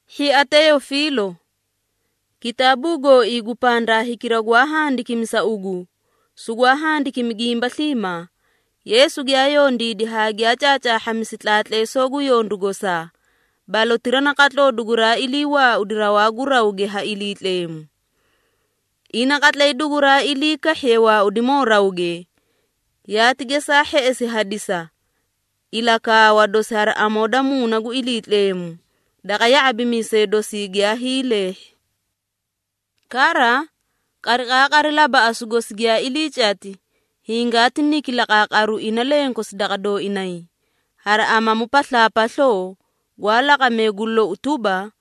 Hhia Teyofiilo, kitaabuu gooii gu pandaa hikira gwaa handikimi sa ugu, sugwaa handikimi gimba sliimaa, Yeesu giyaa yondiidi haa giyaa caacaahhamisi tlaatleesoo gu yondu gosaa, balotira naqatloo duguraa ilii waaudi rawaa gu rawge ha Iliitleemu. Ina qatlay duguraa ilii kahhiye waaudimoo rawge, yaati gesaa hheꞌesi hadisi ilakaawa dosi hari amoo da Muuna gu Iliitleemu, daqa ya⁄abimiisee dosii giyaa hiileehhi. Kara, qariqaaqari labaꞌasu gosi giyaa ilii cati, hingaati niki laqaaqaru ina lenkosi daqa dooinay, hari amamu paslaapasloo, gwaa laqamee gu lou tuba,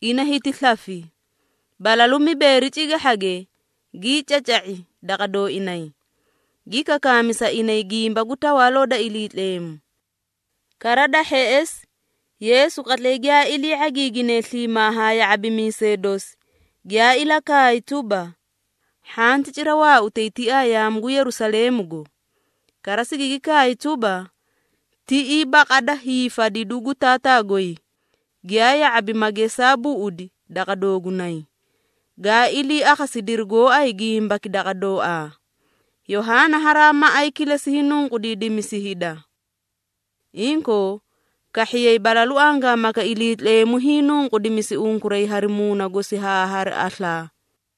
ina hiti slafi. Balalu mibeeri cigahhage gii caca⁄i daqa dooinay, gi kakaami sa inay gimba gu Tawaaloo da Iliitleemu. Kara da hheꞌesi, Yeesu qatlay giyaa ilii ⁄agiigine sliimaa haa ya⁄abimiisee dosi, giyaa ilakaay tuba, “Hhanti cira waautay tiaa yaamu gu Yerusaleemugo. Kara sigigi kaay tuba, tiꞌii baqada hiifadidu gu Taataa goy, giyaa ya⁄abi ma gesaa buꞌudi daqa doogunay, gaa ilii akhasidiri gooay gimbaki daqa dooaa. Yohaana haraa maꞌay kilesi hiinunqudiidimisi hida. Inkoo, kahhiyay balalu angaamaka Iliitleemu hiinunqudimisi unkuray hari Muuna gosi haa hari aslaa.”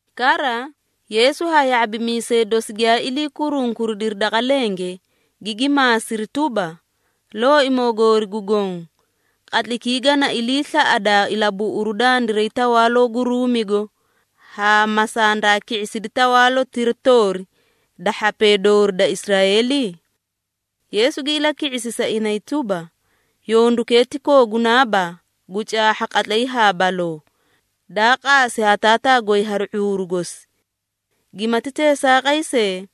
Kara, Yeesu haa ya⁄abimiisee dosi giyaa ilii kurunkuridiri daqa lenge, gigi maasiri tuba, “Looimoo goori gu Goõ, qatlaykii gana ilii slaꞌadaa ilabuꞌuru dandiray tawaaloo gu Ruumigo, haa ma sandaa ki⁄isidi tawaalotira toori da hhapee doorii da Israeeli?” Yeesu gi ilaki⁄isi sa inay tuba, “Yondukee ti koogunaaba gu caahha qatlay haa baloo, daa qaasi ha Taataa goy hari ⁄uuru gosi. Gimati teesaaqay see,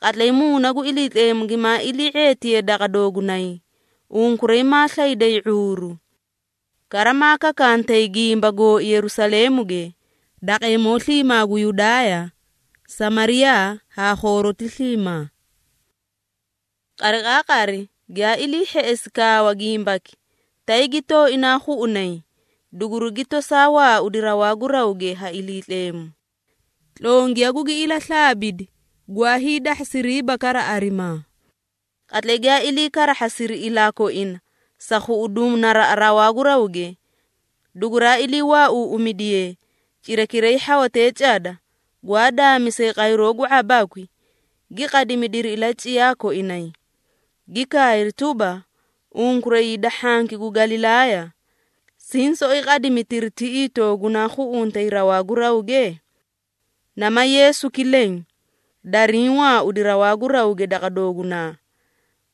qatlay Muuna gu Iliitleemu gimaa ilii ⁄eetiye daqa doogunay, unkuray maa slayday ⁄uuru. Kara maa kakantay gimba gooi Yerusaleemuge, daqeemoo sliimaa gu Yudaaya, Samariyaa haa khooroti sliimaa.” Qariqaaqari giyaa ilii hheꞌesi kaawa gimbaki, tay gi tooinaa khuꞌunay, dugurigi tosaa waaudi rawaa gu rawge ha Iliitleemu. Tlongiya gugi ilaslaabidi, gwaa hiidahhasiriiba kara arimaa. Qatlay giyaa ilii karahhasiri ilaa koina sa khuꞌuduũ naraꞌa rawaa gu rawge, duguraa ilii waauuꞌumidiye, cirakiray hhawatee cada gwaa daamisee qayroo gu ⁄abakwi, gi qadimidiri ilaciyaa koinay, gi kaayri tuba, “Unkuray hida hhanki gu Galilaaya, siĩ soꞌoyi qadimitiri tiꞌii toogunaa khuꞌuntay rawaa gu rawge? Nama Yeesuki leẽ, dariĩ waaudi rawaa gu rawge daqa doogunaa,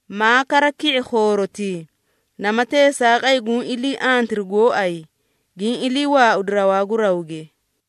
maa kara ki⁄i khoorotii, nama teesaaqay guũ ilii antiri gooay, giĩ ilii waaudi rawaa gu rawge.”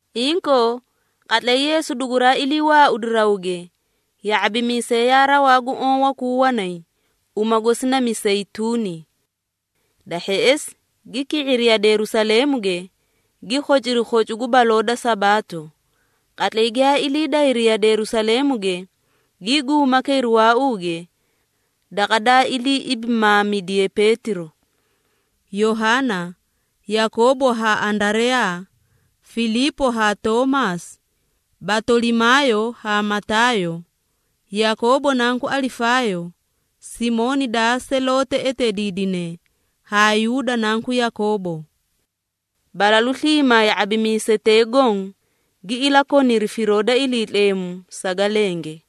Inkoo, qatlay Yeesu duguraa ilii waaudi rawge, ya⁄abimiisee yaa rawaa gu oõ wakuu wanay, uma gosi na Miseyituuni. Da hheꞌesi gi ki⁄iri yade Yerusaleemuge, gi khociri khocu gu baloo da Sabaato. Qatlay giyaa ilii dayri yade Yerusaleemuge, gii guuma kayri waauu gwaa rawaa gu marage waara, daqa daa ilii ibimaamidiye Peetiro, Yohaana, Yakoobo haa Andareyaa, Filiipo haa Toomaasi, Batolimaayo haa Mataayo, Yakoobo nanku Alifaayo, Simooni daa Seloote eteediidine haa Yuuda nanku Yakoobo. Balalu sliimaa ya⁄abimiisetee goõ gi ilakoniri firoo da Iliitleemu saga lenge.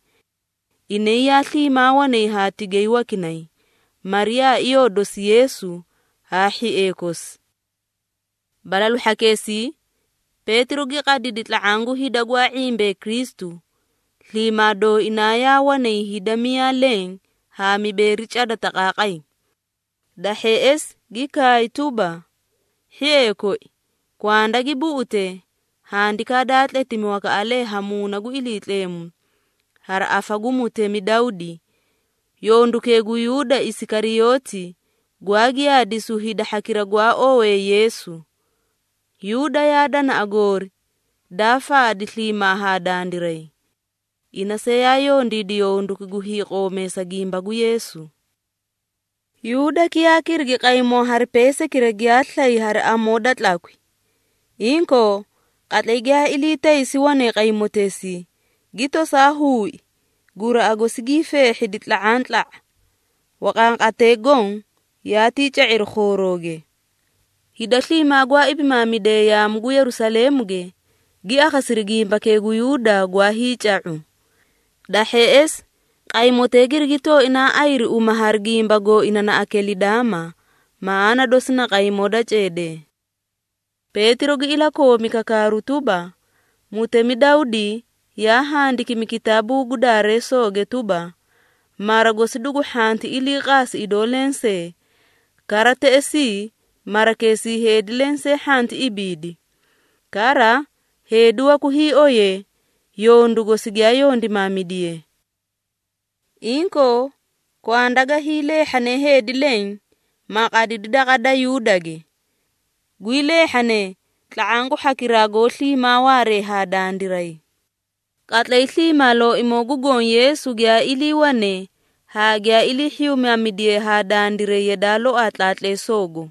Inay yaa sliimaa wanay haa tigay wakinay, Mariyaa iyoo dosi Yeesu haa hhiee kosi. Balalu hhakeesii Peetiro gi qadidi tla⁄aã gu hida gwaa ⁄imbee Kristu, sliimaa dooinaa yaa wanay hida miyaa leẽ haa mibeeri cada taqaaqay. Da hheꞌesi gi kaay tuba, “Hhiee koi, kwanda gi buꞌute, handikaa daa tletimi wakaꞌalee ha Muuna gu Iliitleemu hari afa gu mutemi Dawdi, yondukee gu Yuuda Isikariyooti, gwaa giyaadisu hida hhakira gwaa owee Yeesu. Yuuda yaa danaꞌa goori, daa faadi sliimaa haa dandiray. Ina see yaa yondiidi yonduki gu hiiqoomeesa gimba gu Yeesu.” (Yuudaki yaa kirigi qaymoo hari peesaykira giyaa slay hari amoo da tlakwi. Inkoo, qatlay giyaa ilii taysi wane qaymoteesii, gi tosaa huui, guraꞌa gosi gii feehhidi tla⁄antla⁄a, waqanqatatee goõ yaatii ca⁄iri khoorooge. Hida sliimaa gwaa ibimaamidee yaamu gu Yerusaleemuge, gi akhasiri gimbakee gu Yuuda gwaa hiica⁄u. Da hheꞌesi qaymotee girigi tooinaa ayiri uma hari gimba gooina na “Akelidaama,” maꞌaana dosi na “qaymoo da ceedee.”) Peetiro gi ilakoomi kakaaru tuba, “Mutemi Dawdi yaa handikimi kitaabuu gu Daareesooge tuba, ‘Mara gosi dugu hhanti ilii qaasi idoo lensee, kara teꞌesii, marakeesii heedi lensee hhanti ibiidi.’ Kara, ‘Heedi waku hiioye, yondu gosi giyaa yondimaamidiye.’ Inkoo, kwanda ga hiileehhane heedi leẽ, ma qadidi daqa da Yuudage. Gwii leehhane, tla⁄aã gu hhakiraa goó sliimaa waaree ha dandiray. Qatlay sliimaa Looimoo gu Goõ Yeesu giyaa iliiwane haa giyaa ilii hhiyumaamidiye haa dandiray yadaa loaa tlaatleesoogo.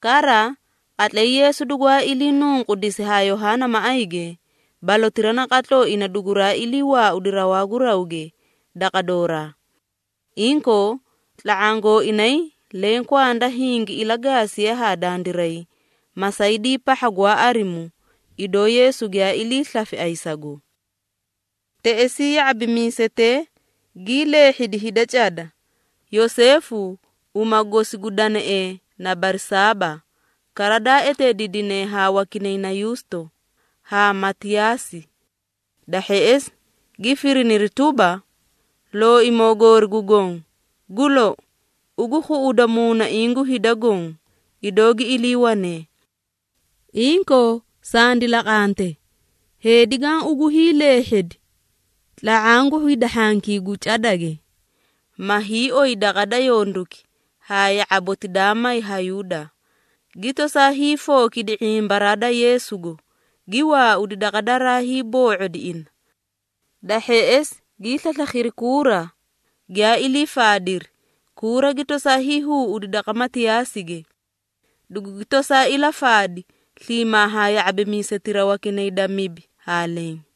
Kara, qatlay Yeesu dugwaa ilii nunqudisi ha Yohaana maꞌayge, balotira naqatloo ina duguraa ilii waaudi rawaa gu rawge daqa dooraa. Inkoo, tla⁄aã gooinay leẽ kwanda hingi ilagaasiye haa dandiray, masaydii pahha gwaa arimu, idoo Yeesu giyaa ilii slafi ayisago.” Teꞌesii ya⁄abimiisetee gii leehhidi hida cada, Yoseefu, uma gosi gu deneꞌee na Barsaaba (kara daa eteediidine ha wakinay na Yuusto), haa Matiyaasi. Da hheꞌesi gi firiniri tuba, “Looimoo goori gu Goõ, gu lou, ugu khuꞌuda muunaiĩ gu hida goõ, idoo gi iliiwanee. Inkoo, sandi laqante, heedi gaã ugu hiileehhedi tla⁄aã gu hida hhankii gu cadage, ma hiioy daqa da yonduki haa ya⁄aboti daa may ha Yuuda, gi tosaa hiifookidi ⁄imbaraa da Yeesugo, gi waaudi daqa daraa hiiboo⁄odi ina.” Da hheꞌesi gii slaslakhiri kuura, giyaa ilii faadiri, kuura gi tosaa hiihuuꞌudi daqa Matiyaasige, dugugi tosaa ilafaadi sliimaa haa ya⁄abimiisetira wakinay da mibi haa leẽ.